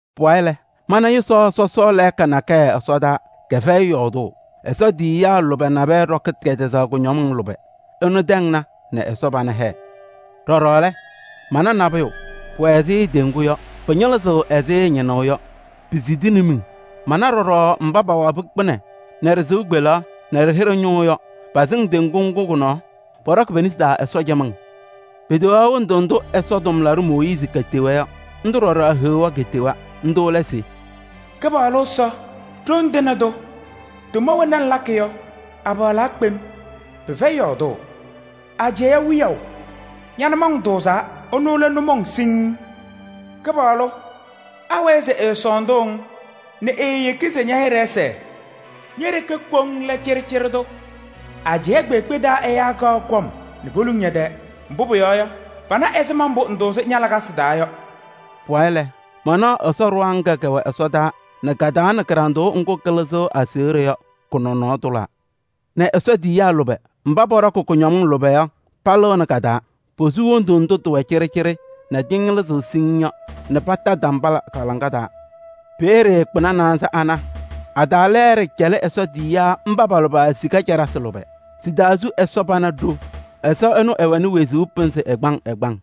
Pʋwayɩ lɛ, mana yʋsaɣ sɔsɔɔ lɛɛka nakɛyɛ ɛsɔdaa, kɛfɛyɩ yɔɔdʋʋ: Ɛsɔ tiyiyaa lʋbɛ nabɛyɛ ɖɔkɩ kɛtɛzaɣ kʋñɔmɩŋ lʋbɛ. Ɩnʋ tɛŋna nɛ Ɛsɔ pana hɛɛ. Ɖɔɖɔ lɛ, mana nabʋyʋ, pʋwɛ ɛzɩ teŋgu yɔ, pɩñɩlɩzɩɣ ɛzɩ ñɩnʋʋ yɔ, pisidini miŋ. Mana ɖɔɖɔ mba pawabɩ kpɩnɛ nɛ ɖɩ-sɩʋ kpeleɣ nɛ ɖɩ-hɩɖɛ ñʋʋ yɔ, pasɩŋ teŋgu ŋgʋ kʋ-nɔɔ. Pɔɖɔkɩ pe-nesi taa Ɛsɔ cɩmɩŋ. Peteɣaɣ hendu ndʋ Ɛsɔ tʋmlaɖʋ Mooyiizi ketewa yɔ. Ndʋ ɖɔɖɔ Heɣa ketewa. Ndʋ lɛ se: “Kɩpaɣlʋ Ɛsɔ, Ɖoŋ Tɩŋa Tʋ! Tʋma wena ŋlakɩ yɔ, apaɣlaa kpem, pɩfɛyɩ yɔɔdʋʋ! Ajɛɛ Wiyaʋ! Ña-nʋmɔŋ tʋʋzaa, ɩnʋ lɛ nʋmɔŋ siŋŋ. Kɩpaɣlʋ! Awɛɛ se ɛɛsɔɔndʋʋ-ŋ nɛ eeyeki se ña-hɩɖɛ ɛsɛɛ? Ñe-ɖeke koŋ lɛ cɩɖɩcɩɖɩ tʋ. Ajɛɛ kpeekpe taa ɛyaa kaɣ kɔm nɛ poluŋ ñɛ-tɛɛ, mbʋ pʋyɔɔ yɔ, pana ɛzɩma mbʋ ŋtʋʋzɩ ña-lakasɩ taa yɔ.” Pʋwayɩ lɛ, manaɣ Ɛsɔ ɖɩɣa ŋga kɛwɛ ɛsɔdaa nɛ ka-taa nɛ kɩɖanɖʋʋ ŋgʋ kɩlɩzɩɣ aseɣɖe yɔ, kɔ-nɔnɔɔ tʋlaa nɛ Ɛsɔ tiyiyaa lʋbɛ mba pɔɖɔkɩ kʋñɔmɩŋ lʋbɛ yɔ, palɩɣnɩ ka-taa. Posu wondu ndʋ tɩwɛ cɩɖɩcɩɖɩ nɛ tɩñɩlɩzɩɣ siŋŋ yɔ nɛ pata tambala pa-laŋa taa. Peeye kpɩna naanza ana a-taa lɛɛɖɛ cɛlɩ Ɛsɔ tiyiyaa mba pa-lʋbɛ sika caɖasɩ lʋbɛ. Sɩ-taa su Ɛsɔ pana ɖo. Ɛsɔ ɛnʋ ɛwɛnɩ wezuu pɩnzɩ ɛgbaŋ ɛgbaŋ.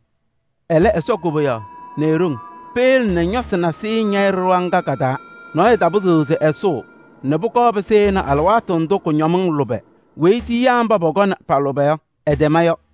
Ɛlɛ Ɛsɔ koboyaɣ nɛ e-ɖoŋ peyele nɛ ñɔsɩ nasɩyɩ ñɛyɩ ɖɩɣa ŋga ka-taa. Nɔɔyʋ tapɩzɩɣ se ɛsʋʋ nɛ pʋkɔɔ pɩsɩnɩ alɩwaatʋ ndʋ kʋñɔmɩŋ lʋbɛ weyi tiyiyaa mba pɔkɔnɩ pa-lʋbɛ yɔ, ɩtɛma yɔ.